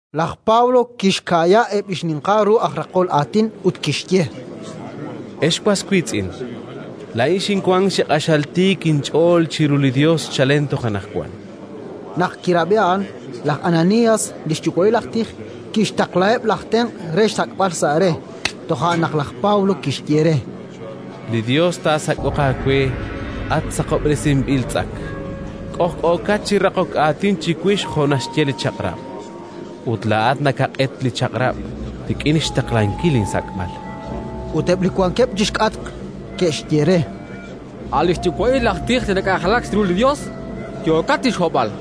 Laj Pablo kixka'ya eb' li xninqal ru aj raqol aatin ut kixye: —Ex was wiitz'in, laa'in xinwank chi q'axal tiik inch'ool chiru li Yos chalen toj anaqwan. Naq kirab'i a'an laj Ananías, li xyuwa'il aj tij, kixtaqlaheb' laj tenq' re xsak'b'al sa' re. Toja' naq laj Pablo kixye re: —Li Yos taasak'oq aawe, at saqob'resinb'il tz'ak! K'ojk'ookat chi raqok aatin chiwix jo' naxye li Chaq'rab', ut laa'at nakaq'et li Chaq'rab' rik'in xtaqlankil insak'b'al. Ut eb' li wankeb' chi xk'atq ke'xye re: —A' li xyuwa'il aj tij li nak'anjelak chiru li Yos yookat chi xhob'b'al!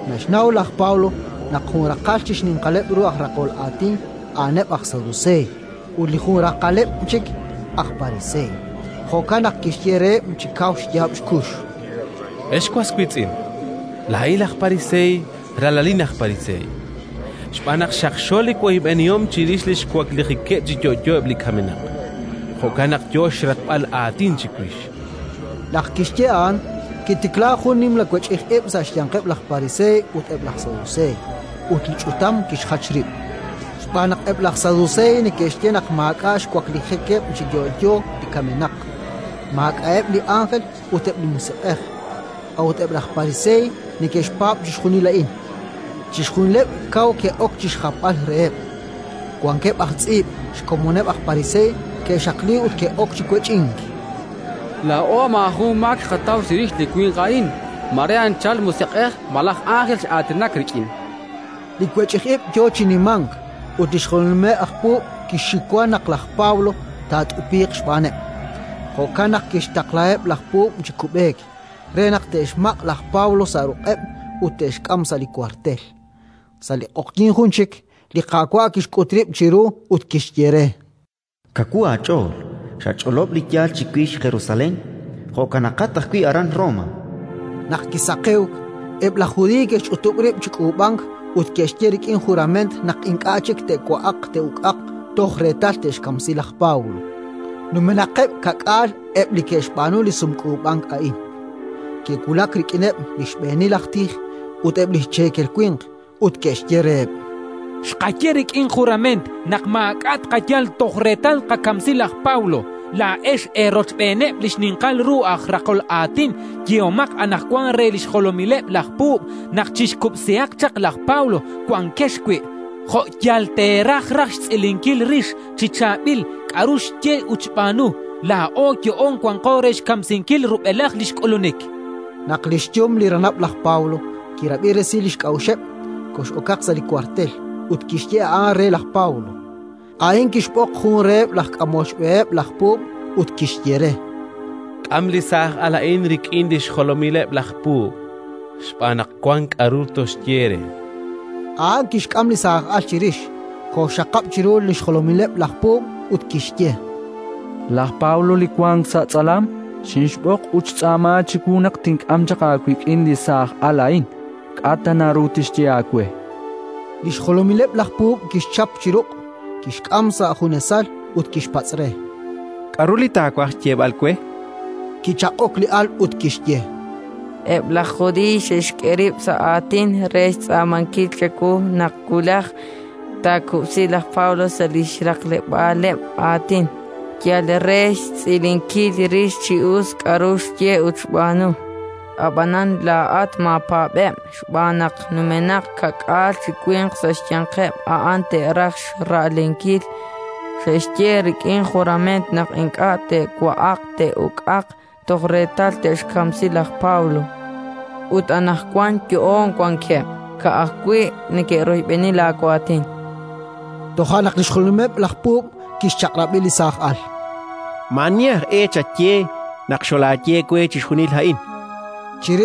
Naxnaw laj Pablo naq jun raqal chi xninqaleb' ru aj raqol aatin a'aneb' aj Saduseey ut li jun raqaleb' chik aj Pariseey; jo'kan naq kixye reheb' chi kaw xyaab' xkux: —Ex was wiitz'in, laa'in aj Pariseey, ralalin aj Pariseey. Xb'aan naq xaqxo li woyb'enihom chirix li xwaklijikeb' chi yo'yo eb' li kamenaq, jo'kan naq yo xraqb'al aatin chiwix. Naq kixye a'an, kitiklaak jun nimla wech'ij ib' sa' xyanqeb' laj Pariseey ut eb' laj Saduseey, ut li ch'utam kixjach rib'. Xb'aan naq eb' laj Saduseey neke'xye naq maak'a' xwaklijikeb' chi yo'yo li kamenaq, maak'a'eb' li ánjel ut eb' li musiq'ej; a'ut eb' laj Pariseey neke'xpaab' chixjunil a'in. Chixjunileb' kaw ke'ok chi xjapb'al reheb'. Wankeb' aj tz'iib' xkomoneb' laj Pariseey ke'xaqliik ut ke'ok chi wech'ink: —Laa'o maajun maak naqataw chirix li winq a'in. Mare anchal musiq'ej malaj ánjel x'aatinak rik'in, chankeb'. Li wech'ij ib' yo chi nimank ut li xjolomileb' laj puub' kixxiwa naq laj Pablo taat'upiiq xb'aaneb'; jo'kan naq kixtaqlaheb' laj puub' chi kub'eek, re naq te'xmaq' laj Pablo sa' ruq'eb' ut te'xk'am sa' li wartel. Sa' li q'oqyink jun chik, li Qaawa' kixk'ut rib' chiru ut kixye re: “Kawu aach'ool! Xach'olob' li yaal chiwix Jerusalén; jo'kanaqat ajwi' aran Roma”. Naq kisaqewk, eb' laj Judiiy ke'xch'utub' rib' chi k'uub'ank ut ke'xye rik'in jurament naq ink'a' chik te'wa'aq te'uk'aq toj reetal te'xkamsi laj Pablo. Numenaqeb' ka'k'aal eb' li ke'xb'aanu li sumk'uub'ank a'in. Ke'wulak rik'ineb' li xb'eenil aj tij ut eb' li cheekel winq, ut ke'xye reheb': —Xqaye rik'in jurament naq maak'a' tqayal toj reetal tqakamsi laj Pablo. Laa'ex eerochb'eeneb' li xninqal ru aj raqol aatin yehomaq anaqwan re li xjolomileb' laj puub' naq chixkub'sihaq chaq laj Pablo wankex wi', jo' yal teeraj raj xtz'ilinkil rix chi chaab'il k'aru xye ut xb'aanu. Laa'o yo'oon wanqo re xkamsinkil rub'elaj li xk'ulunik. Naq li xyum li ranab' laj Pablo kirab'i resil li xk'a'uxeb', kox'okaq sa' li wartel ut kixye a'an re laj Pablo. A'in kixb'oq jun reheb' laj k'amol xb'eheb' laj puub' ut kixye re: —K'am li saaj al a'in rik'in li xjolomileb' laj puub' xb'aan naq wank k'aru toxye re. A'an kixk'am li saaj al chirix, koxxaqab' chiru li xjolomileb' laj puub' ut kixye: —Laj Pablo li wank sa' tz'alam xinxb'oq ut xtz'aama chiwu naq tink'am chaq aawik'in li saaj al a'in. K'a' tana ru tixye aawe. Li xjolomileb' laj puub' kixchap chi ruq', kixk'am sa' junesal ut kixpatz' re: —K'aru li taawaj xyeeb'al we? Kichaq'ok li al ut kixye: —Eb' laj Judiiy xe'xk'e rib' sa' aatin re xtz'aamankil chawu naq wulaj taakub'si laj Pablo sa' li xraqleb'aaleb' aatin, yal re xtz'ilinkil rix chi us k'aru xye ut xb'aanu. Ab'anan laa'at maapaab'eb', xb'aan naq numenaq ka'k'aal chi winq sa' xyanqeb' a'an te'raj xra'lenkil: xe'xye rik'in jurament naq ink'a' te'wa'aq te'uk'aq toj reetal te'xkamsi laj Pablo. Ut anaqwan yo'oon wankeb'; ka'ajwi' neke'royb'eni laawaatin. Toja' naq li xjolomileb' laj puub' kixchaq'rab'i li saaj al: “Maa'ani aj e chaye naq xolaye we chixjunil a'in”, chan re.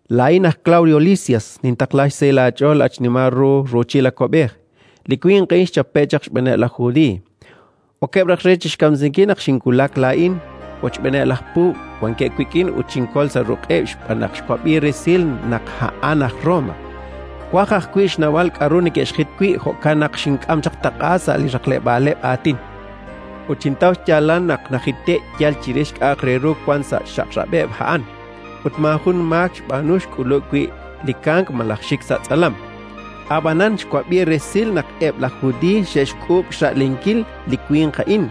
“Laa'in aj Klawdio Lisias nintaqla xsahil aach'ool, at xnimal ru ruuchil li awab'ej. Li winq a'in xchape'k xb'aaneb' laj Judiiy. Okeb' raj re chi xkamsinkil naq xinwulak laa'in wochb'eeneb' laj puub' wankeb' wik'in ut xinkol sa' ruq'eb', xb'aan naq xwab'i resil naq a'an aj Roma. Xwaj ajwi' xnawb'al k'aru neke'xjit wi'; jo'kan naq xink'am taq'a sa' li xraqleb'aaleb' aatin. Ut xintaw xyaalal naq najite'k yal chirix k'a'aq re ru wank sa' xchaq'rab'eb' a'an ut maajun maak xb'aanu xk'ulub' wi' li kamk malaj xik ta sa' tz'alam. Ab'anan xwab'i resil naq eb' laj Judiiy xe'xk'uub' xra'lenkil li winq a'in;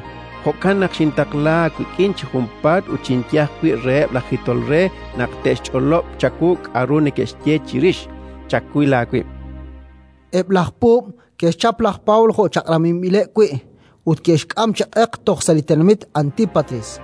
jo'kan naq xintaqla aawik'in chi junpaat ut xinye ajwi' reheb' laj jitol re naq te'xch'olob' chawu k'aru neke'xye chirix. Chawil aawib'”. Eb' laj puub' ke'xchap laj Pablo jo' chaq'rab'inb'ileb' wi' ut ke'xk'am chi q'eq toj sa' li tenamit Antípatris.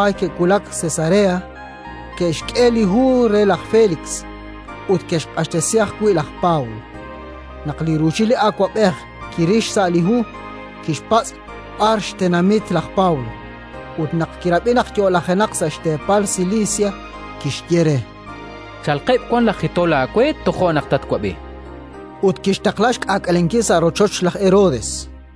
Ut naq ke'wulak Cesarea, ke'xk'e li hu re laj Félix ut ke'xq'axtesi ajwi' laj Pablo. Naq li ruuchil li awab'ej kiril xsa' li hu, kixpatz' b'ar xtenamit laj Pablo, ut naq kirab'i naq yo'lajenaq sa' xteepal Silisia, kixye re: —Chalqeb' wan laj jitol aawe; tojo' naq tatwab'i. Ut kixtaqla xk'aak'alenkil sa' rochoch laj Herodes.